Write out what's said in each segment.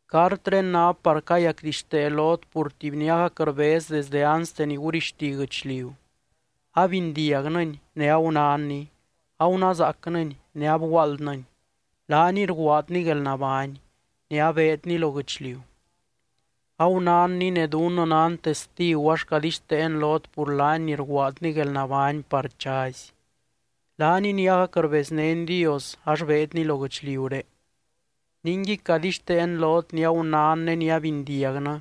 Cartré ná par cayacdixtee lot pur tuby ni agac rbez desde anste ni gurixti guɨchliu. Abindiagnɨny ne agunánny, agunázaacnɨny ne abguaaldnɨny. Laaniy rguaadny guelnabány, ne abeedny lo guɨchliu. Agunánny ne dunnɨ nan testigu ax cadixteen lot pur laany ni rguaadny guelnabány par chazy. Laaniy ni agac rbeznény Dios ax beedny lo guɨchliuré. Ningui cadixteen lot ni agunán ne ni abindiagnɨ,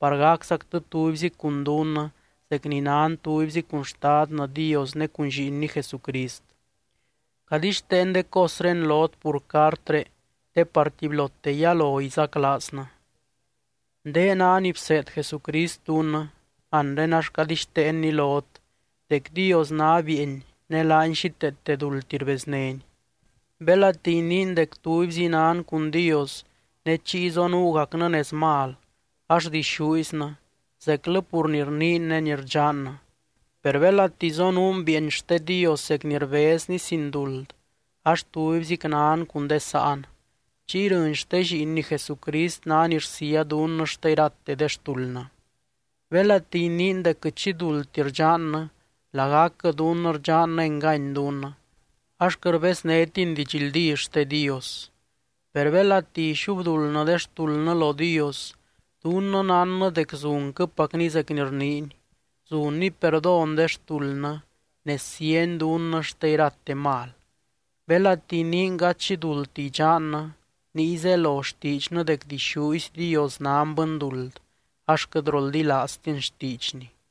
par gaczactɨ tubyzi cun dunnɨ zec ni nan tubyzi cun Xtadnɨ Dios ne cun Lliinny Jesucrist. Cadixteen de cosré lot pur cartré te par tubylote yalo izaclaaznɨ. Ndé ná ni bseed Jesucrist dunnɨ, anre ax cadixteenni lot dec Dios ná bieeny ne laany xíteete duldti rbeznény. Belati iniin dec tubyzi nan cun Dios ne chiy zonuugacnɨ nez mal, ax dixúiznɨ zeclɨ pur ni rniin ne ni rdxannɨ. Per belati zonuun bieeny xte Dios zec ni rbezny sin duld ax tubyzic nan cun de sáan. Chiy rɨny xte Lliinny Jesucrist ná ni rsía dunnɨ xte irate de xtuldnɨ. Belati iniin dec quɨt xi duldti rdxannɨ, lagacquɨ dunnɨ rdxannɨ engany dunnɨ, ax quɨt rbeznétiny didxldí xte Dios. Per belati ixubduldnɨ de xtuldnɨ lo Dios, dunnɨ nánnɨ dec zunquɨpacny zec ni rniiny, zunny perdón de xtuldnɨ ne síany dunnɨ xte irate mal. Belati iniin gady xi duldti idxannɨ, niy zelo xtiidxnɨ dec dixúzy Dios nan bɨnduld ax quɨt roldilaaztin xtiidxny.